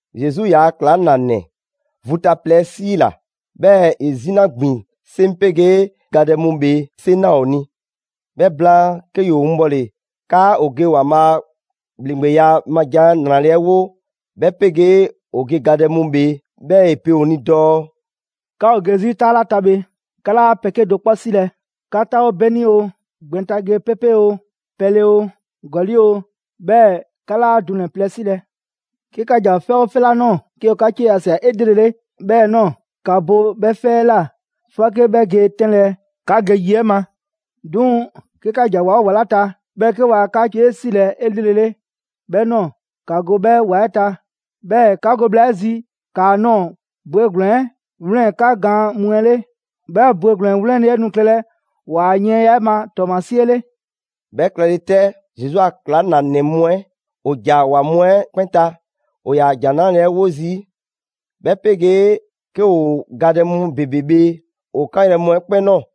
Zesu ‑yaa' ‑klaŋlanɛ vu ta plɛ 'ɛ 'siila‑, 'bhɛɛ‑ ‑e 'zina ‑gbin 'seŋ 'pegee gadɛ mu ‑bhee 'seŋ ꞊naa ‑o ni. 'Bhɛ blaan, 'ke ‑yoo winbɔle 'kaa ‑o ge ‑Waanbhaa' a ‑bhleŋgbeya ma jan ‑nrale' 'ɛ wo 'bhɛ 'pegee ‑o ge gadɛ mu ‑bhee'. 'Bhɛɛ‑ ‑e pe ‑o ni dɔɔ: «'Ka ‑o ge 'zi 'taa 'la ta bhe, 'ka 'laa pɛ 'kedo‑ 'kpɔ 'silɛ‑: 'ka 'taawo 'beni oo, gbɛn ta ge 'pepe oo, pɛle oo, ‑gɔli' oo, 'bhɛɛ‑ 'ka 'laa dunɛ‑ plɛ 'silɛ‑. 'Ke 'ka ‑ja 'fɛ 'oo 'fɛ 'la ꞊nɔɔ, 'ke ‑o 'ka 'cie ꞊sia 'elrele 'bhɛ ꞊nɔɔ, ‑ka bo 'bhɛ 'fɛ 'ɛ ꞊la 'fɔke 'bhɛ ge 'tɛnlɛ‑ 'ka ge yi 'ɛ ma. 'Duŋ‑ 'ke 'ka ‑ja ‑wa 'oo ‑wa 'la ta, 'bhɛɛ‑ 'ke waa 'kaa‑ 'cie 'silɛ‑ 'elrele 'bhɛ ꞊nɔɔ, ‑ka go 'bhɛ ‑wa 'ɛ ta. 'Bhɛɛ‑ 'ka go bhla 'ɛ zi ‑kaa ꞊nɔɔ bwegblɛn‑ 'ɛ 'wlɛn 'ka gaan mu 'ɛ 'le: 'bhɛ bwegblɛn‑ 'wlɛnle‑ 'ɛ nu klɛlɛ ‑waa yiɛnya 'ɛ ma ‑tɔɔmasie 'le.» 'Bhɛ klɛle 'tɛ, Zesu a ‑klaŋlanɛ mu 'ɛ ‑o ‑ja ‑wa mu 'ɛ 'kpɛn ta. ‑O ‑yaa ‑Jan 'Nrale‑ 'ɛ 'wo zii', 'bhɛ 'pegee 'ke ‑o gadɛ mu ‑bebe bhee ‑o 'kanyrɛ‑ mu 'ɛ 'kpɛn ꞊nɔɔ.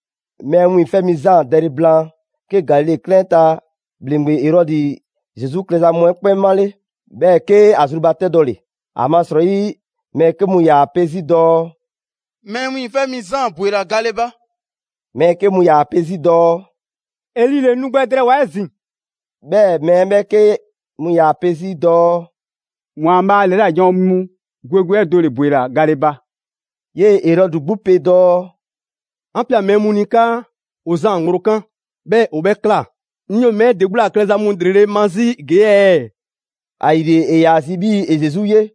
Mɛɛ Wiiŋfɛ' Mi Zaan dɛle blaan, 'ke Galile 'klɛɛn 'ɛ ta ‑bhleŋgbe Erɔdi Zesu klɛza mu 'ɛ 'kpɛn 'male, 'bhɛɛ‑ 'ke ‑a zrubatɛdɔle. ‑Amasrɔyi mɛɛ 'ke mu ‑yaa 'pe 'zi dɔɔ: «Mɛɛ Wiiŋfɛ' Mi Zaan ‑bwela gale ba.» Mɛɛ 'ke mu ‑yaa 'pe 'zi dɔɔ: «Eli ‑le nu gbɛ drɛɛwoa‑ 'ezin‑.» 'Bhɛɛ‑ mɛɛ ‑bhɛɛke' mu ‑yaa pe 'zi dɔɔ: «‑Waanbhaa' ‑lɛla' janwo mu gwe gwe 'ɛ do ‑le ‑bwela gale ba.» 'Yee‑ Erɔdi 'gbu pe dɔɔ: «'An ꞊pia mɛɛ mu ni 'kaa ‑o Zaan ŋgblo 'kan, 'bhɛɛ‑ ‑o 'bhɛ ꞊kla. 'Ŋ 'yoo‑ mɛɛ 'ɛ ‑de 'gbu ‑la klɛza mu ‑lrele' ma 'zi ‑gee' ɛɛ?» ‑Ayile ‑e ‑yaa zi 'bhii‑ ‑e Zesu 'ye.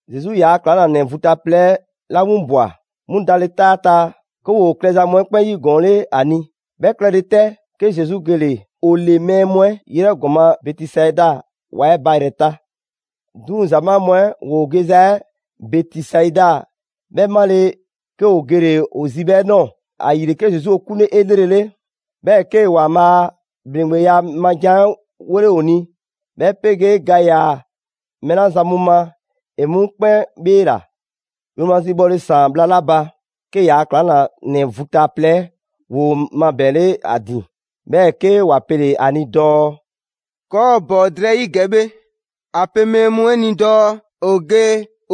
Zesu ‑yaa' ‑klaŋlanɛ vu ta plɛ 'la 'winbwa‑, 'mu dale 'taa 'ɛ ta, 'ke ‑woo klɛza mu 'ɛ 'kpɛn 'yigɔɔnle 'a ni. 'Bhɛ klɛle 'tɛ, 'ke Zesu gele‑ ‑o ‑le mɛɛ mu 'ɛ 'yrɛ ‑gɔma' Bɛtisaida ‑wa 'ɛ ba ‑yrɛ ta. 'Duŋ‑ ‑zamaa' mu 'ɛ ‑woo geza 'ɛ Bɛtisaida 'bhɛ 'male‑, 'kee‑ ‑o gele ‑o zi 'bhɛ ꞊nɔɔ. ‑Ayile 'ke Zesu ‑o 'kunle 'elrele. 'Bhɛɛ‑ 'kee‑ ‑Waanbhaa' a ‑bhleŋgbeya ma ‑jan 'ɛ 'wole ‑o ni, 'bhɛ 'pegee ga ‑yaa mɛɛ 'la zan mu ma ‑e 'mu 'kpɛn 'bheela‑. Yromazi bhɔle ‑saan bhla 'la ba, 'ke ‑yaa' ‑klaŋlanɛ vu ta plɛ 'ɛ ‑woo mabɛɛnle 'a ‑din, 'bhɛɛ‑ 'ke ‑wa pele‑ ‑a ni dɔɔ: «‑Kɔɔ' ‑o ‑bɔn drɛyi' ‑gɛ bhe, ‑a pe mɛɛ mu 'ɛ ni dɔɔ ‑o ge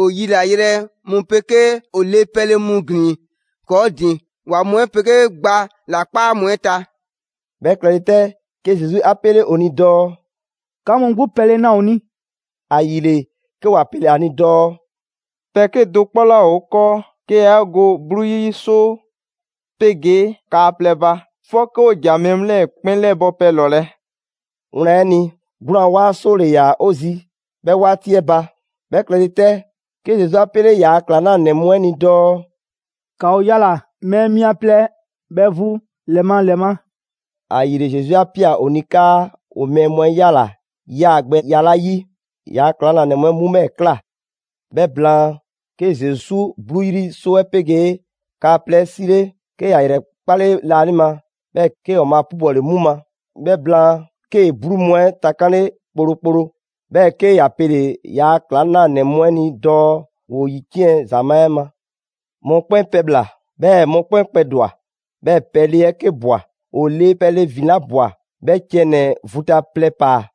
‑o yilayrɛ mu 'pegee ‑o le pɛle mu ‑glin ‑kɔɔ' ‑din ‑wa mu 'ɛ 'pegee gba la 'kpaa mu 'ɛ ta.» 'Bhɛ klɛle 'tɛ, 'ke Zesu 'a 'pele ‑o ni dɔɔ: «'Ka mu 'gbu pɛle na ‑o ni!» ‑Ayile 'ke ‑wa pele ‑a ni dɔɔ: «Pɛ 'kedo‑ 'kpɔ 'laa ‑o 'kɔɔ 'ke yaa 'e go 'bluu 'yri 'soo 'pegee kaa plɛ ba. 'Fɔke 'o ‑ja mɛɛ mu 'lɛɛ‑ 'kpɛn 'lɛbɔ‑ pɛ ‑lɔlɛ'.» Wlan 'ɛ ni, 'gwlaan‑ 'waa 'soo ‑le ‑yaa ‑o zi 'bhɛ 'waati 'ɛ ba. 'Bhɛ klɛle 'tɛ, 'ke Zesu 'a 'pele ‑yaa' ‑klaŋlanɛ mu 'ɛ ni dɔɔ: «‑Ka ‑o yala‑ mɛɛ mia plɛ bhɛ vu ‑lɛ ma ‑lɛ ma.» ‑Ayile, Zesu 'a ꞊pia ‑o ni 'kaa ‑o mɛɛ mu 'ɛ 'yala‑ yaa‑ gbɛya 'la 'yi, ‑yaa' ‑klaŋlanɛ mu 'ɛ 'mu 'bhɛɛ‑ ꞊kla. 'Bhɛ blaan, 'ke Zesu 'bluu 'yri 'soo 'ɛ 'pegee kaa plɛ 'ɛ 'sile, 'ke ‑ya ‑yrɛkpale laanima, 'bhɛɛ‑ 'kee‑ ‑Waanbhaa' 'pubɔle 'mu ma. 'Bhɛ blaan, 'kee‑ 'bluu mu 'ɛ takanle kplokplo, 'bhɛɛ‑ 'ke ‑ya pele‑ ‑yaa' ‑klaŋlanɛ mu 'ɛ ni dɔɔ ‑woo ‑yiciɛn' ‑zamaa' 'ɛ ma. Mɔkpɛn' pɛbhla‑, 'bhɛɛ‑ mɔkpɛn' kpɛdwa‑, 'bhɛɛ‑ pɛle 'ɛ 'ke ꞊bwa. ‑O le pɛle ‑vin 'la ꞊bwa, 'bhɛ ciɛ ‑nɛ vu ta plɛ ‑paa.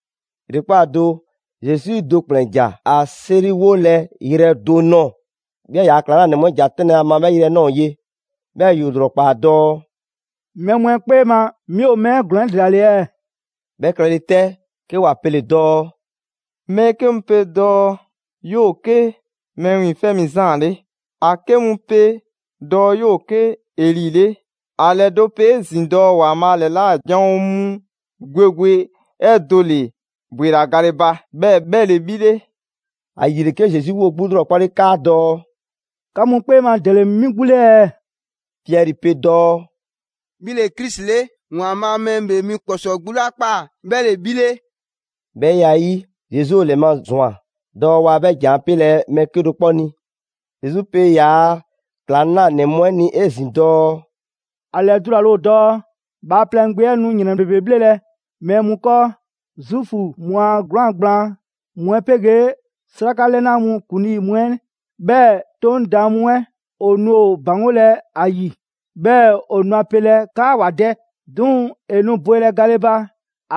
‑Yrekpaa' do, Zesu do ‑kplɛn ‑ja ‑a 'seriwolɛ yrɛ do ꞊nɔɔ, 'bhɛɛ‑ ‑yaa' ‑klaŋlanɛ mu 'ɛ ‑ja 'tɛnlɛ‑ ‑a ma 'bhɛ yrɛ 'ɛ ꞊nɔɔ ye. 'Bhɛɛ‑ ‑yoo ‑lrɔkpaa dɔɔ: «Mɛɛ mu 'ɛ 'kpee ma, 'mi ‑o mɛɛ ‑glɔɔn 'ɛ ‑dela ‑le ɛɛ?» 'Bhɛ klɛle 'tɛ, 'ke ‑wa pele‑ dɔɔ: «Mɛɛ 'ke mu pe dɔɔ 'yoo‑ 'ke Mɛɛ Wiiŋfɛ' Mi Zaan 'le, ‑a 'ke mu pe dɔɔ 'yoo‑ 'ke Eli 'le. ‑A ‑lɛdo' pe 'ezin‑ dɔɔ ‑Waanbhaa' ‑lɛla' janwo mu gwe gwe 'ɛ do ‑le ‑bwela gale ba, 'bhɛɛ‑ 'bhɛ ‑le 'bhi 'le.» ‑Ayile, 'ke Zesu 'woo‑ 'gbu 'lrɔkpale 'kaadɔɔ‑: «'Ka mu 'kpee ma ‑dele 'mi 'gbu 'le ɛɛ?» Piɛri pe dɔɔ: «'Bhi ‑le Krisi 'le, ‑Waanbhaa' Mɛɛ ‑Bhee Mi ‑Kpɔsɔɔ 'gbu 'la ꞊kpaa 'bhɛ ‑le 'bhi 'le.» 'Bhɛ ya 'ɛ 'yi, Zesu ‑o ‑lɛmazwan dɔɔ waa 'bhɛ za 'ɛ 'pelɛ‑ mɛɛ 'kedo‑ 'kpɔ ni. Zesu pe ‑yaa' ‑klaŋlanɛ mu 'ɛ ni 'ezin‑ dɔɔ: «‑A ‑lɛdulale ‑o dɔɔ Bhaaplɛŋ Gbe 'ɛ nu ‑yrɛn ‑bebe bhlelɛ mɛɛ mu 'kɔɔ: Zuufu mu a 'gwlaan‑ gblaan mu 'ɛ 'pegee 'sraka 'lɛna mu ‑kuŋlii mu 'ɛ, 'bhɛɛ‑ 'Toŋ daan mu 'ɛ ‑o nu ‑o ‑baŋgolɛ ‑a ‑yi. 'Bhɛɛ‑ ‑o nu a pelɛ 'kaa ‑wa dɛ. 'Duŋ‑ ‑e nu bwelɛ gale ba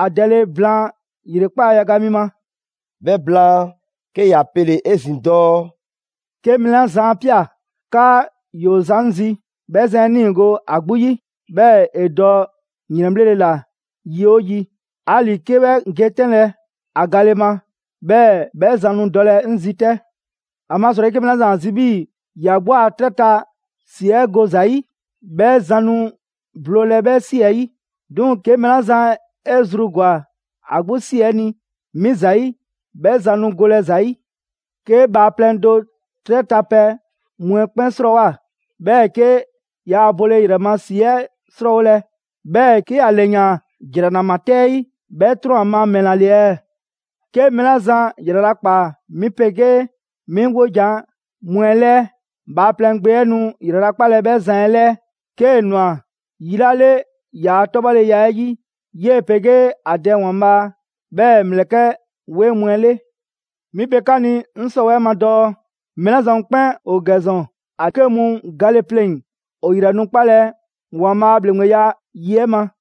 ‑a dɛle blaan ‑yrekpaa' yaga mi ma.» 'Bhɛ blaan, 'ke ‑ya pele‑ 'ezin‑ dɔɔ: «'Ke mɛɛ 'la zan 'a ꞊pia 'kaa ‑yoo zan 'ŋ zi, 'bhɛ zan 'ɛ 'niigo‑ ‑a 'gbu 'yi, 'bhɛɛ‑ ‑e dɔ ‑yrɛnbhlele ‑la yi 'oo yi, 'ali‑ 'ke 'bhɛ ge 'tɛnlɛ‑ ‑a gale ma; 'bhɛɛ‑ 'bhɛ zan nu dɔlɛ 'ŋ zi 'tɛ. ‑Amasrɔyi 'ke mɛɛ 'la zan ‑a zi 'bhii‑ ‑ya 'gbu a 'trɛ ta ‑si 'ɛ go ‑za ‑yi, 'bhɛ zan nu bloolɛ 'bhɛ 'si 'ɛ 'yi. 'Duŋ‑ 'ke mɛɛ 'la zan 'e zru ‑gwa ‑a 'gbu 'si 'ɛ ni 'mi ‑zayi', 'bhɛ zan nu golɛ ‑za 'yi. 'Ke bhaaplɛŋ do 'trɛ ta pɛ mu 'ɛ 'kpɛn 'srɔɔwoa‑, 'bhɛɛ‑ 'ke yaa bole ‑yrɛ ma ‑si 'ɛ 'srɔɔwolɛ, 'bhɛɛ‑ 'ke ‑a ‑lɛyaan ‑jranama 'tɛ 'ɛ 'yi; 'bhɛ 'trɔn‑ ‑a ma ‑mɛla ‑le ɛɛ? 'Ke mɛɛ 'la zan ‑yralakpaa 'mi 'pegee 'mi 'wojan‑ mu 'ɛ 'lɛɛ, Bhaaplɛŋ Gbe 'ɛ nu ‑yralakpalɛ 'bhɛ zan 'ɛ 'lɛɛ, 'kee‑ ꞊nwa yi 'la 'le ‑yaa' 'tɔbhɔleya 'ɛ 'yi 'yee‑ 'pegee ‑a Dɛ ‑Waanbhaa' 'bhɛɛ‑ ‑mlɛkɛ' 'weŋ mu 'ɛ 'le. 'Mi pe 'ka ni 'ŋ 'sɔwɛɛ‑ 'ɛ ma dɔɔ: Mɛɛ 'la zan mu 'kpɛn ‑o ‑gɛ ‑zɔn, ‑a 'ke mu gale pleŋ‑, ‑o ‑yrɛ nu 'kpalɛ‑ ‑Waanbhaa' a ‑bhleŋgbeya yi 'ɛ ma.»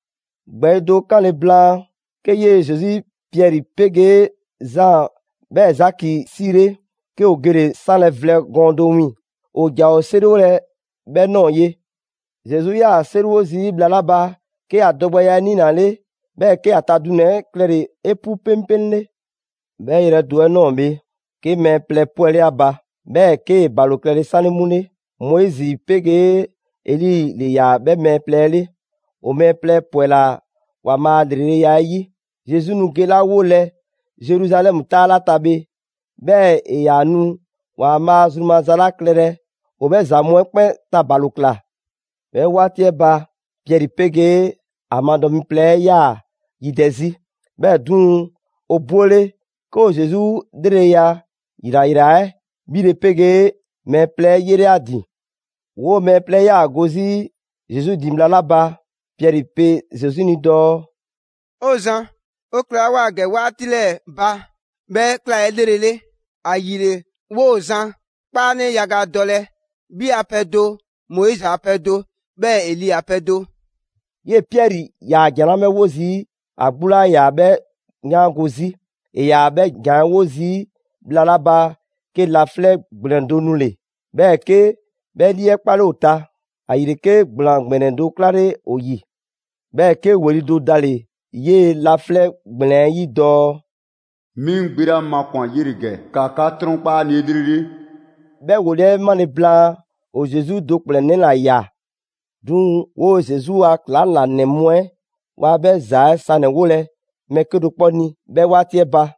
‑Gbɛɛyi' do 'kanle blaan, 'ke 'yee‑ Zesu Piɛri 'pegee Zaan 'bhɛɛ‑ Zaki 'siile, 'ke ‑o gele 'sanlɛ‑ vlɛ gɔɔn do wiiŋ‑. ‑O ‑ja ‑o 'seriwolɛ 'bhɛ ꞊nɔɔ ye. Zesu 'yaa‑ 'seriwo zii' bhla 'la ba 'ke ‑a dɔgbɛya 'ɛ niinale, 'bhɛɛ‑ 'ke ‑a ta dunɛ‑ 'ɛ klɛle‑ 'epu 'peŋpeŋle. 'Bhɛ yrɛ do 'ɛ ꞊nɔɔ bhe, 'ke mɛɛ plɛ 'pwɛle ‑a ba, 'bhɛɛ‑ 'kee‑ ‑balo klɛle 'sanle 'mu 'le: Moizi 'pegee Eli ‑le ‑yaa 'bhɛ mɛɛ plɛ 'ɛ 'le. ‑O mɛɛ plɛ ‑pwɛla ‑Waanbhaa' a ‑lreleya 'ɛ 'yi, Zesu nu gelawolɛ Zeruzalɛmu 'taa 'la ta bhe, 'bhɛɛ‑ ‑e ‑yaa nu ‑Waanbhaa' zru maza 'la klɛlɛ, ‑o 'bhɛ ‑za mu 'ɛ 'kpɛn ta ‑balo ꞊kla. 'Bhɛ 'waati 'ɛ ba, Piɛri 'pegee a madɔ mi plɛ 'ɛ, ‑yaa yidɛ 'zi. 'Bhɛɛ‑ 'duŋ‑, ‑o ‑bwele', 'ke ‑o Zesu 'lreleya ‑yrayra 'ɛ 'bhile‑ 'pegee mɛɛ plɛ 'ɛ 'yele‑ ‑a ‑din. 'Woo‑ mɛɛ plɛ 'ɛ 'yaa‑ go 'zi Zesu ‑din bhla 'la ba, Piɛri pe Zesu ni dɔɔ: «'O Zan, 'o klɛlawoa ‑gɛ 'waati 'ɛ 'lɛɛ‑ ba 'bhɛ ꞊kla 'elrele, ‑ayile 'woo‑ zan 'kpaanɛ yaga dɔlɛ: 'Bhi a pɛ do, Moizi a pɛ do 'bhɛɛ‑ Eli a pɛ do.» 'Yee‑ Piɛri ‑yaa ‑jan 'la 'bhɛ 'wo zii', ‑a 'gbu 'laa ‑yaa 'bhɛ 'yaango‑ 'zi. ‑E ‑yaa 'bhɛ ‑jan 'ɛ 'wo zii' bhla 'la ba, 'ke laflɛ' ‑gblɛn do nule‑, 'bhɛɛ‑ 'ke 'bhɛ lii 'ɛ 'kpale ‑o ta. ‑Ayile 'ke ‑gblaan ‑gbɛnɛ do 'klale ‑o ‑yi. 'Bhɛɛ‑ 'ke ‑weli do dale‑ 'yee‑ laflɛ' ‑gblɛn 'ɛ 'yi dɔɔ: «'Mi 'ŋ Gbe 'la makwan‑ 'yele‑ ‑gɛ, ‑ka 'ka 'trɔnkpa 'a ni 'elrele!» 'Bhɛ ‑weli' 'ɛ 'male‑ blaan, ‑o Zesu do ‑kplɛnnɛ' ‑la ꞊ya. 'Duŋ‑ 'woo‑ Zesu a ‑klaŋlanɛ mu 'ɛ waa 'bhɛ ‑za 'ɛ sanɛ‑ 'wolɛ‑ mɛɛ 'kedo‑ 'kpɔ ni 'bhɛ 'waati 'ɛ ba.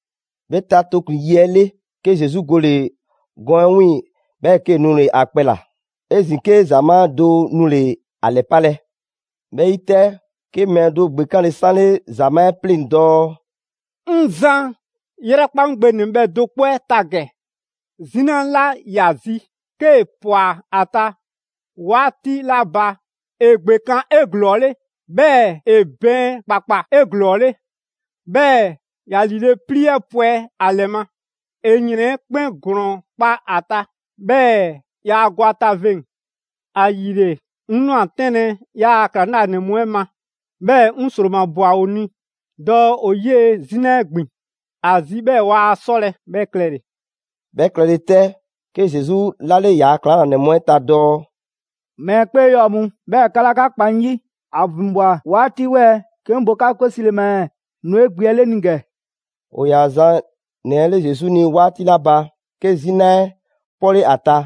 'Bhɛ ta tooklin‑ yi 'ɛ 'le, 'ke Zesu gole‑ gɔɔn 'ɛ 'wiiŋ‑, 'bhɛɛ‑ 'kee‑ nule‑ ‑a kpɛ ‑la. 'Ezin‑ 'ke ‑zamaa' do nule ‑a ‑lɛpalɛ. 'Bhɛ 'yi 'tɛ, 'ke mɛɛ do ‑gbekanle 'sanle ‑zamaa' 'ɛ 'pleŋ‑ dɔɔ: «'Ŋ Zan, 'yrɛkpa 'ŋ gbe ‑nɛbhɛ' do 'kpɔ 'ɛ ta ‑gɛ! 'Zina 'la ‑ya zi, 'kee ꞊pwa ‑a ta 'waati 'la ba, ‑e ‑gbekan' 'eglɔɔle, 'bhɛɛ‑ ‑e bɛɛn ‑kpakpa 'eglɔɔle, 'bhɛɛ‑ ‑ya ‑liile' 'plii 'ɛ pwɛ ‑a ‑lɛ ma. ‑E ‑yrɛn 'ɛ 'kpɛn ‑glɔɔn kpa a ta, 'bhɛɛ‑ yaa go ‑a ta veŋ‑. ‑Ayile, 'ŋ ꞊nwa 'tɛnlɛ‑ 'yaa‑ ‑klaŋlanɛ mu 'ɛ ma, 'bhɛɛ‑ 'ŋ ‑sromabwa ‑o ni dɔɔ ‑o 'yee‑ 'zina 'ɛ ‑gbin ‑a zi 'bhɛɛ‑ waa 'sɔlɛ‑ 'bhɛ klɛle‑.» 'Bhɛ klɛle 'tɛ, 'ke Zesu 'lale ‑yaa' ‑klaŋlanɛ mu 'ɛ ta dɔɔ: «Mɛɛ 'kpee 'yɔɔ‑ mu, 'bhɛɛ‑ 'ka 'laa 'ka kpa 'ŋ 'yi! ‑A ‑vinbwa 'waati 'wɛɛ‑ 'ke 'ŋ bo 'ka 'kwe 'sile‑ ma ɛɛ? Nu 'e gbe 'ɛ 'le 'ŋ ni ‑gɛ.» ‑O ‑yaa zan ‑nɛ 'ɛ 'le Zesu ni 'waati 'la ba, 'ke 'zina 'ɛ 'pɔle ‑a ta,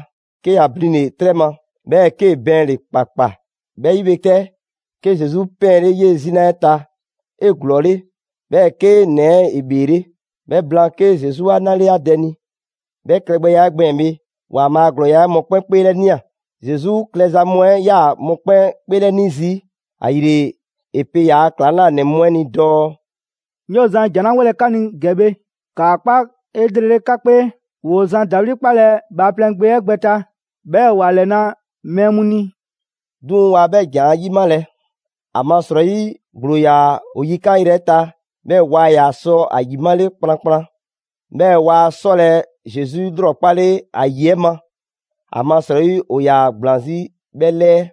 'ke ‑ya blinle‑ 'trɛ ma, 'bhɛɛ‑ 'kee‑ bɛɛnle‑ ‑kpakpa. 'Bhɛ 'yi bhe 'tɛ, 'ke Zesu 'pɛɛnle 'yee‑ 'zina 'ɛ ta 'eglɔɔle, 'bhɛɛ‑ 'ke ‑nɛ 'ɛ 'bheele. 'Bhɛ blaan 'ke Zesu 'a 'nale ‑a dɛ ni. 'Bhɛ klɛgbɛya 'ɛ gbɛɛn‑ bhe, ‑Waanbhaa' a ‑glɔɔya' 'ɛ ‑e mɔkpɛn' 'kpeelɛnia. Zesu klɛza mu 'ɛ ꞊yaa mɔkpɛn' 'kpeelɛni zii', ‑ayile ‑e pe ‑yaa' ‑klaŋlanɛ mu 'ɛ ni dɔɔ: «'Ŋ 'yoo‑ zan ‑jan 'la 'wolɛ‑ 'ka ni ‑gɛ bhe, ‑kaa 'kpa 'elrele 'ka 'kpee: ‑Woo zan ‑dawli' 'kpalɛ‑ Bhaaplɛŋ Gbe 'ɛ gbɛ ta, 'bhɛɛ‑ ‑wa ‑lɛna' mɛɛ mu ni.» 'Duŋ‑ waa 'bhɛ ‑jan 'ɛ 'yimalɛ, ‑amasrɔyi ‑gblo ‑yaa ‑o yikan' 'yrɛ ta,'bhɛɛ‑ waa ‑yaa sɔ ‑a ‑yimale kplankplan. 'Bhɛɛ‑ waa 'sɔlɛ‑ Zesu 'lrɔkpale ‑a ‑yi 'ɛ ma, ‑amasrɔyi ‑o ‑yaa ‑gblaan 'zi 'bhɛ 'lɛɛ.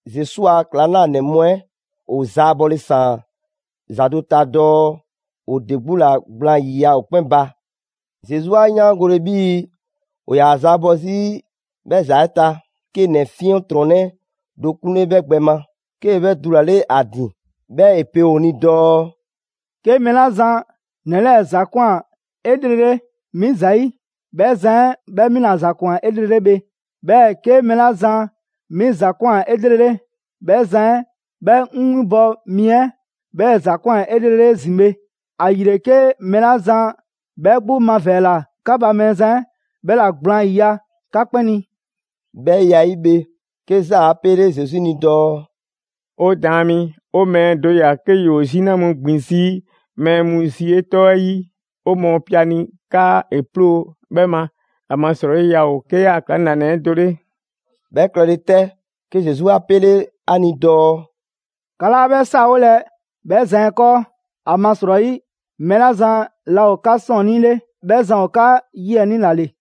Zesu a ‑klaŋlanɛ mu 'ɛ ‑o zaabɔle ‑saan ‑za do ta dɔɔ ‑o ‑de 'gbu ‑la gblaan ‑yiya' ‑o 'kpɛn ba. Zesu 'a 'yaangole 'bhii‑ ‑o ‑yaa zaabɔ 'zi 'bhɛɛ‑ ‑za 'ɛ ta, 'kee ‑nɛ 'fiɛntrɔnnɛ do 'kunle 'bhɛ gbɛ ma, 'kee‑ 'bhɛ dulale ‑a ‑din. 'Bhɛɛ‑ ‑e pe ‑o ni dɔɔ: «'Ke mɛɛ 'la zan ‑nɛ 'lɛɛ‑ ‑za ꞊kwan 'elrele 'mi ‑zayi', 'bhɛ zan 'ɛ 'bhɛ 'mi ‑la ‑za ‑kwan 'elrele bhe. 'Bhɛɛ‑ 'ke mɛɛ 'la zan 'mi ‑za ‑kwan 'elrele, 'bhɛ zan 'ɛ 'bhɛ 'ŋ 'winbɔ‑ mi 'ɛ 'bhɛɛ‑ ‑za ‑kwan 'elrele 'ezin‑ bhe. ‑Ayile 'ke mɛɛ 'la zan 'bhɛ 'gbu mavɛɛla 'ka ba 'bhɛ zan 'ɛ 'bhɛla‑ gblaan 'yiya‑ 'ka 'kpɛn ni.» 'Bhɛ ya 'ɛ 'yi bhe, 'ke Zaan 'a pele Zesu ni dɔɔ: «'O Daan mi, 'o mɛɛ do ‑ya 'ke ‑yoo 'zina mu ‑gbin 'zi mɛɛ mu zi 'e 'tɔ 'ɛ 'yi. 'O mɔɔ pe ‑a ni 'kaa ‑e 'ploo‑ 'bhɛ ma, ‑amasrɔyi ‑yaa ‑o 'ke 'yaa‑ ‑klaŋlanɛ 'ɛ do 'le.» 'Bhɛ klɛle 'tɛ, 'ke Zesu 'a 'pele ‑a ni dɔɔ: «'Ka 'laa 'bhɛ 'saawolɛ 'bhɛ zan 'ɛ 'kɔɔ, ‑amasrɔyi, mɛɛ la zan laa ‑o 'ka 'sɔɔnnii 'le, 'bhɛ zan ‑o 'ka 'yiɛnii ‑la ‑le.»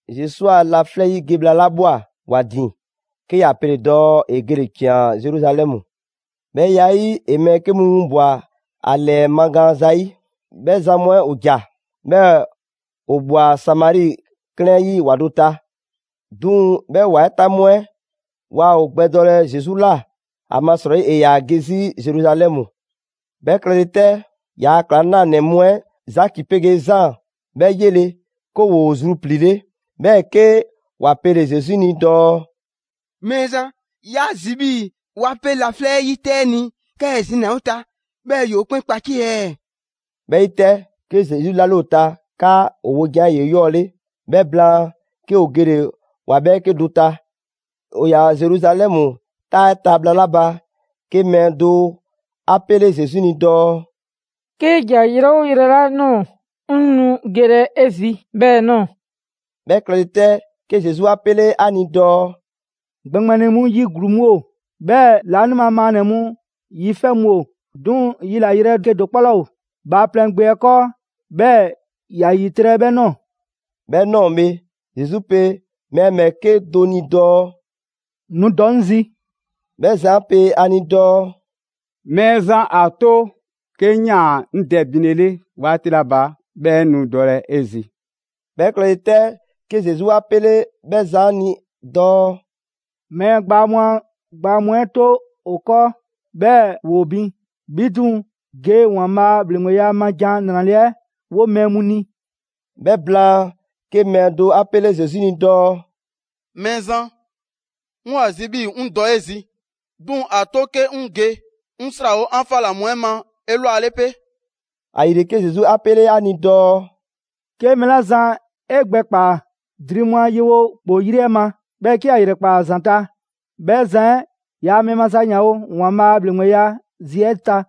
Zesu a laflɛ' 'yi ge bhla 'la ꞊bhwa ‑wa ‑din, 'ke ‑ya pele‑ dɔɔ ‑e gele‑ ‑cian Zeruzalɛmu. 'Bhɛ ya 'ɛ 'yi, ‑e mɛɛ 'ke mu winbwa‑ ‑a ‑lɛɛ magaan zayi'. 'Bhɛ zan mu 'ɛ ‑o ‑ja, 'bhɛɛ‑ ‑o ꞊bhwa Samari 'klɛɛn 'ɛ 'yi ‑wa do ta. 'Duŋ‑ 'bhɛ ‑wa 'ɛ ta mu 'ɛ waa ‑o gbɛdɔlɛ Zesu ꞊la, ‑amasrɔyi ‑e ‑yaa ge 'zi Zeruzalɛmu. 'Bhɛ klɛle 'tɛ, ‑yaa' ‑klaŋlanɛ mu 'ɛ, Zaki 'pegee Zaan 'bhɛ 'yele‑ 'ke ‑woo zrupliile, 'bhɛɛ‑ 'ke ‑wa pele‑ Zesu ni dɔɔ: «Mɛɛzan, 'ya zi 'bhii 'wa 'pe laflɛ' 'yi 'tɛ 'ɛ ni 'kaa ‑e zina‑ ‑o ta, 'bhɛɛ‑ ‑yoo 'kpɛn kpacie ɛɛ?» 'Bhɛ 'yi 'tɛ, 'ke Zesu 'lale ‑o ta 'kaa ‑o wojan 'ɛ ‑yoo 'eyɔɔle. 'Bhɛ blaan, 'ke ‑o gele‑ ‑wa 'bhɛɛke do ta. ‑O ‑yaa Zeruzalɛmu 'taa 'ɛ ta bhla 'la ba, 'ke mɛɛ do 'a 'pele Zesu ni dɔɔ: «'Kee ‑ja yrɛ 'oo yrɛ 'la ꞊nɔɔ, 'ŋ nu gelɛ 'e zi 'bhɛɛ‑ ꞊nɔɔ.» 'Bhɛ klɛle 'tɛ, 'ke Zesu 'a 'pele 'a ni dɔɔ: «‑Gbɛŋgbɛni mu yi ‑gluu mu ‑o, 'bhɛɛ‑ laanima maannɛ‑ mu yi 'fɛ mu ‑o, 'duŋ‑ yilayrɛ 'kedo‑ 'kpɔ 'laa ‑o Bhaaplɛŋ Gbe 'ɛ 'kɔɔ 'bhɛɛ‑ ‑ya ‑yitrɛ' 'bhɛ ꞊nɔɔ.» 'Bhɛ ꞊nɔɔ bhe, Zesu pe mɛɛ ‑bhɛɛke' do ni dɔɔ: «Nu dɔ 'ŋ zi!» 'Bhɛ zan 'ɛ pe ‑a ni dɔɔ: «Mɛɛzan, ‑a 'to 'ke 'ŋ ꞊yaan 'ŋ dɛ binlele 'waati 'la ba 'bhɛɛ‑ 'ŋ nu dɔlɛ 'e zi.» 'Bhɛ klɛle 'tɛ, 'ke Zesu 'a 'pele 'bhɛ zan 'ɛ ni dɔɔ: «Mɛɛ gbaa mu a gbaa mu 'ɛ 'to ‑o 'kɔɔ, 'bhɛɛ‑ ‑woo bin. 'Bhi 'duŋ‑, ge ‑Waanbhaa' a ‑bhleŋgbeya ma 'ɛ ‑Jan 'Nrale‑ 'ɛ 'wo mɛɛ mu ni.» 'Bhɛ blaan, 'ke mɛɛ do 'a 'pele Zesu ni dɔɔ: «Mɛɛzan, 'ŋ 'yoo‑ ‑a zi 'bhii‑ 'ŋ dɔ 'e zi, 'duŋ‑ ‑a 'to 'ke 'ŋ ge 'ŋ 'srawo 'an 'fa ꞊la mu 'ɛ ma 'elwale 'pe.» ‑Ayile 'ke Zesu 'a 'pele ‑a ni dɔɔ: «'Ke mɛɛ 'la zan 'e gbɛ ꞊kpaa dri mu a yewo ‑kpoo 'yri 'ɛ ma, 'bhɛɛ‑ 'ke ‑ya 'yrɛkpaa‑ ‑a ‑zanta', 'bhɛ zan 'ɛ yaa mɛɛ maza ‑yanwo' ‑Waanbhaa' a ‑bhleŋgbeya zi 'ɛ ta.»